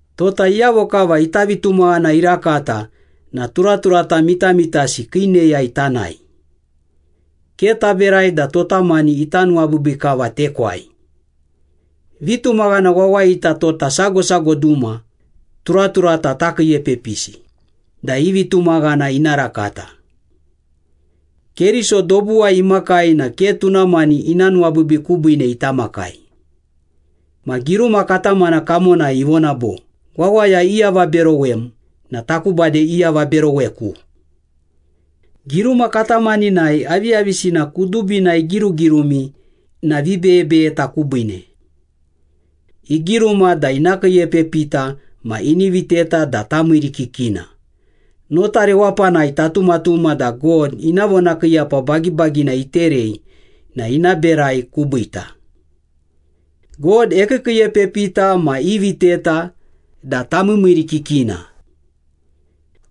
Tota iyavo kava ita vitumaghana irakata na turaturata mitamitasi kii neyai tanae. Ke taberai da tota mani ita nuwabiibii kava tekwai. Vitumaghana wawayita tota sago sago duma turaturata takiiepepisi da i vitumaghana ina rakata. Keriso dobuwai imakai na ke tuna mani ina nuwabiibii kubiine ita makai. Ma giruma katamana kamonai ivona bo, “Wawaya iavaberowem na taku bade iavaberoweku.” Giruma katamaninai aviyavisina kudubina igirugirumi na vibeyebeyeta kubiine. Igiruma da ina kiiepepita ma ini viteta da tamiirikikina, nota rewapanai tatumatuma da God ina vonakiiyapa bagibagina iterei na ina berai kubiita. God ekiikiiepepita ma iviteta da tamiimiirikikina.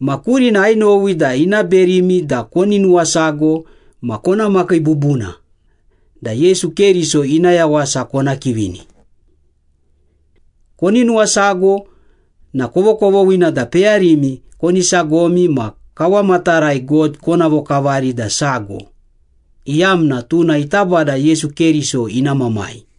Ma kurina ainowi da ina berimi da koni nuwasago ma kona makii bubuna, da Yesu Keriso ina yawasa kona kivini. Koni nuwasago na kovokovoghina da peyarimi koni sagomi ma kawamatarai God kona vokavari da sago, iyamna tuna ita Bada Yesu Keriso ina Mamai.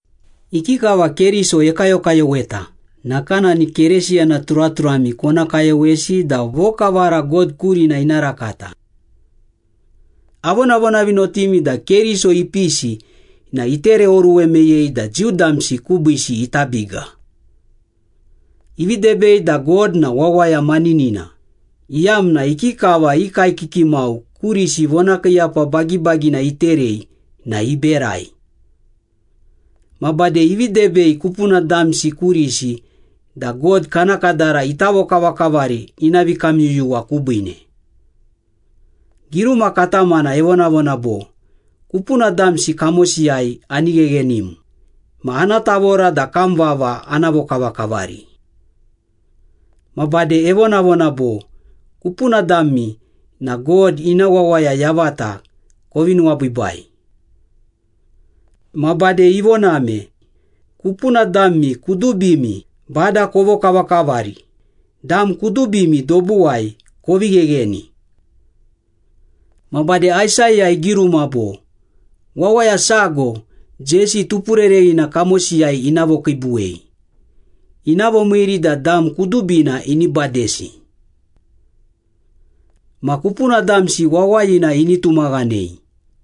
Ikikava Keriso ekayokayoweta, nakanani Keresiyana turaturami kona kayowesi da vokavara God kurina ina rakata. Avonavonavinotimi da Keriso ipisi na itereoruwe meyei da Jiu damsi kubiisi ita biga. Ivi debei da God na wawaya maninina, iyamna ikikava i kaekiki mau kurisi vonakiiyapa bagibagina iterei na iberai. Ma bade ivi debei kupuna damsi kurisi da God kana kadara ita vokavakavari ina vikamyuyuwa kubiine. Giruma katamana evonavona bo, “Kupuna damsi kamosiyai ani gheghenim, ma ana tavora da kam vava ana vokavakavari.” Ma bade evonavona bo, “Kupuna dami na God ina wawaya yavata kovi nuwabiibai.” Ma bade ivoname, “Kupuna dami kudubimi Bada kovokavakavari, dam kudubimi dobuwai kovi ghegheni.” Ma bade Aisaya igiruma bo, “Wawaya sago Jesi tupurereghina kamosiyai ina vokiibuwei, ina vomiiri da dam kudubina ini badesi. Ma kupuna damsi wawayina ini tumaghanei.”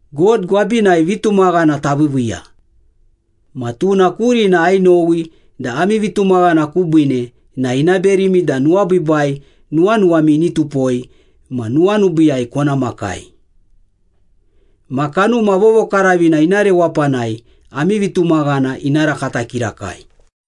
God gwabinai vitumaghana taviiviiya. Ma tuna kurina ainowi da ami vitumaghana kubiine na ina berimi da nuwabiibai nuwanuwami ini tupoi ma nuwanubiiyai kona makai. Ma Kanuma Vovokaravina ina rewapanai ami vitumaghana ina rakata kirakai.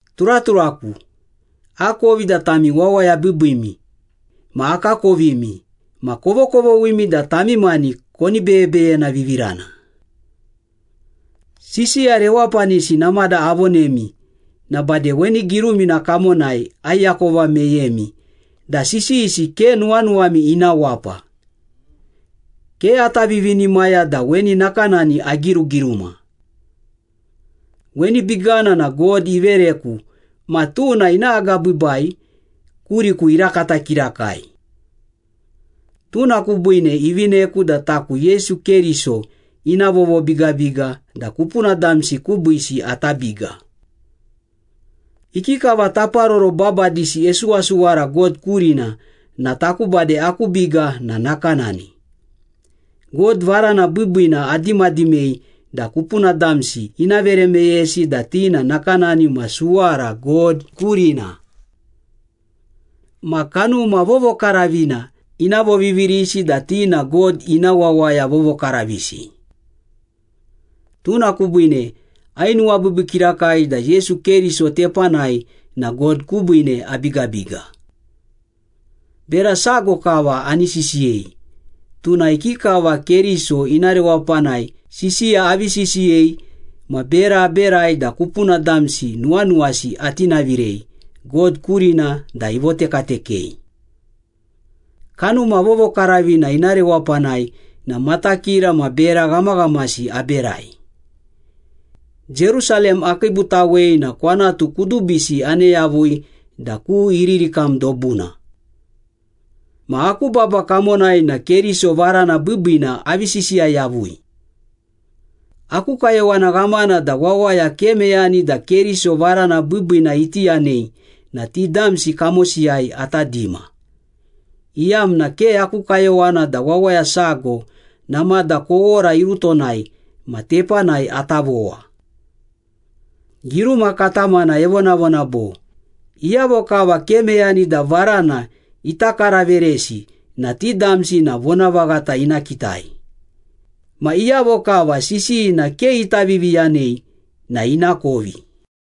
Turaturaku, akovi da tami wawaya biibiimi ma akakovimi ma kovokovoghimi da tami mani koni beyebeyenavivirana. Sisiya rewapanisi namada avonemi na bade weni girumina kamonai aiakova meyemi da sisiyisi ke nuwanuwami ina wapa. Ke ata vivinimaya da weni nakanani agirugiruma. Weni bigana na God ivereku ma tuna ina agabiibai kuriku irakata kirakai. Tuna kubiine ivineku da taku Yesu Keriso ina vovobigabiga da kupuna damsi kubiisi ata biga. Ikikava taparoro babadisi esuwasuwara God kurina na taku bade aku biga na nakanani. God varana biibiina adimadimei da kupuna damsi ina vere meyesi da ti na nakanani ma suwara God kurina. Ma Kanuma Vovokaravina ina vovivirisi da ti na God ina wawaya vovokaravisi. Tuna kubiine ainuwabiibii kirakai da Yesu Keriso tepanai na God kubiine abigabiga. Bera sago kava ani sisiyei, tuna ikikava Keriso ina rewapanai sisiya avi sisiyei ma bera aberai da kupuna damsi nuwanuwasi atinavirei God kurina da ivotekatekei. Kanuma Vovokaravina ina rewapanai na matakira ma bera ghamaghamasi aberai. Jerusalem akiibutawei na kwanatu kudubisi ane yavui da ku Iririkam dobuna. Ma aku baba kamonai na Keriso varana biibiina avi sisiya yavui. Aku kayowana ghamana da wawaya ke meyani da Keriso varana biibiina iti yanei na ti damsi kamosiyai ata dima, iyamna ke aku kayowana da wawaya sago namada kowora irutonai ma tepanai ata vowa. Giruma katamana evonavona bo, “Iyavo kava ke meyani da varana ita karaveresi na ti damsi na vonavaghata ina kitai, ma iyavo kava sisiyina ke ita viviyanei na inakovi.”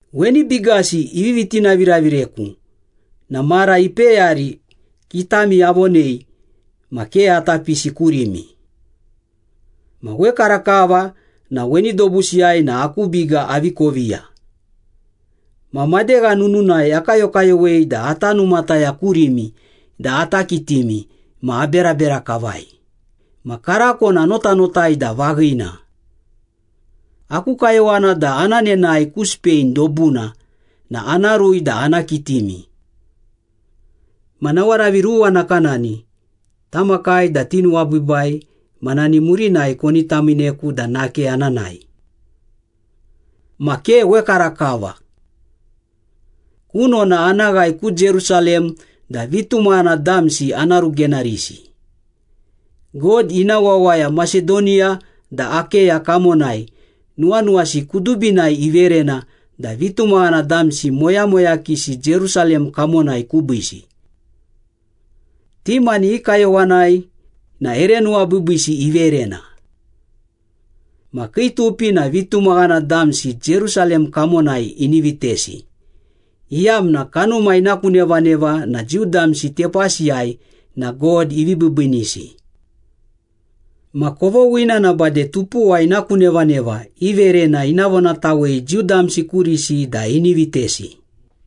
Weni bigasi ivivi tinaviravireku na mara ipeyari kitami avonei ma ke ata pisi kurimi. Ma wekarakava na weni dobusiyai na aku biga avi koviya. Ma madegha nununai akayokayowei da ata numataya kurimi da ata kitimi ma aberabera kavai, ma karako na anotanotai da vaghina. Aku kayowana da ana nenae ku Spain dobuna na ana rui da ana kitimi. Ma nawaravi ruwa nakanani tamakai da tinuwabiibai ma nani murinai koni tamiineku da nake ana nae. Ma ke wekarakava. Kunona ana ghae ku Jerusalem da vitumaghana damsi ana rugenarisi. God ina wawaya Masedoniya da Akeya kamonai nuwanuwasi kudubinai iverena da vitumaghana damsi moyamoyakisi Jerusalem kamonai kubiisi. Ti mani i kayowanai na ere nuwabiibiisi iverena. Ma kii tupi da vitumaghana damsi Jerusalem kamonai ini vitesi, iyamna kanuma ina ku nevaneva na Jiu damsi tepasiyai na God ivi biibiinisi. Ma kovoghina na bade tupuwa ina ku nevaneva i verena ina vonatawei Jiu damsi kurisi da ini vitesi.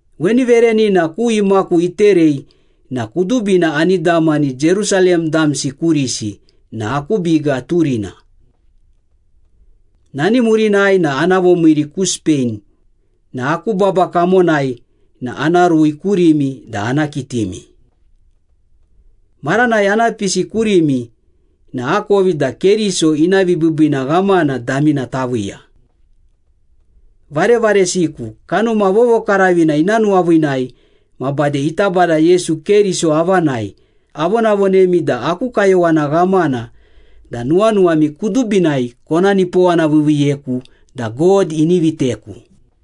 Weni verenina ku imaku iterei na kudubina ani damani Jerusalem damsi kurisi na aku biga turina. Nani murinai na ana vomiiri ku Spain na aku baba kamonai na ana rui kurimi da ana kitimi. Maranai ana pisi kurimi na akovi da Keriso ina vibiibiina ghamana damina taviiya. Varevaresiku, Kanuma Vovokaravina ina nuwaviinai ma bade ita Bada Yesu Keriso avanai avonavonemi da aku kayowana ghamana da nuwanuwami kudubinai kona nipowanaviiviiyeku da God ini viteku.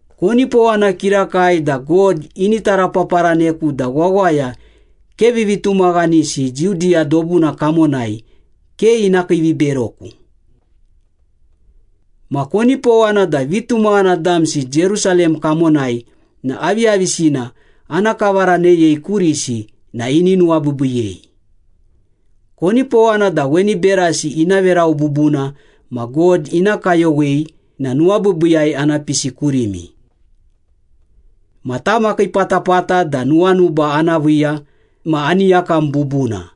Konipowana kirakai da God ini tarapaparaneku da wawaya ke vivitumaghanisi Judiya dobuna kamonai ke ina kiiviberoku. Ma konipowana da vitumaghana damsi Jerusalem kamonai na aviyavisina ana kavaraneyei kurisi na ini nuwabiibiiyei. Konipowana da weni berasi ina verau bubuna ma God ina kayowei na nuwabiibiiyai ana pisi kurimi. Ma tamakiipatapata da nuwanuba ana viiya ma ani yakam bubuna.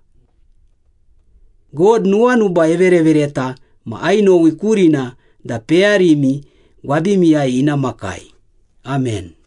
God nuwanuba everevereta ma ainowi kurina da peyarimi gwabimiyai ina makai. Amen.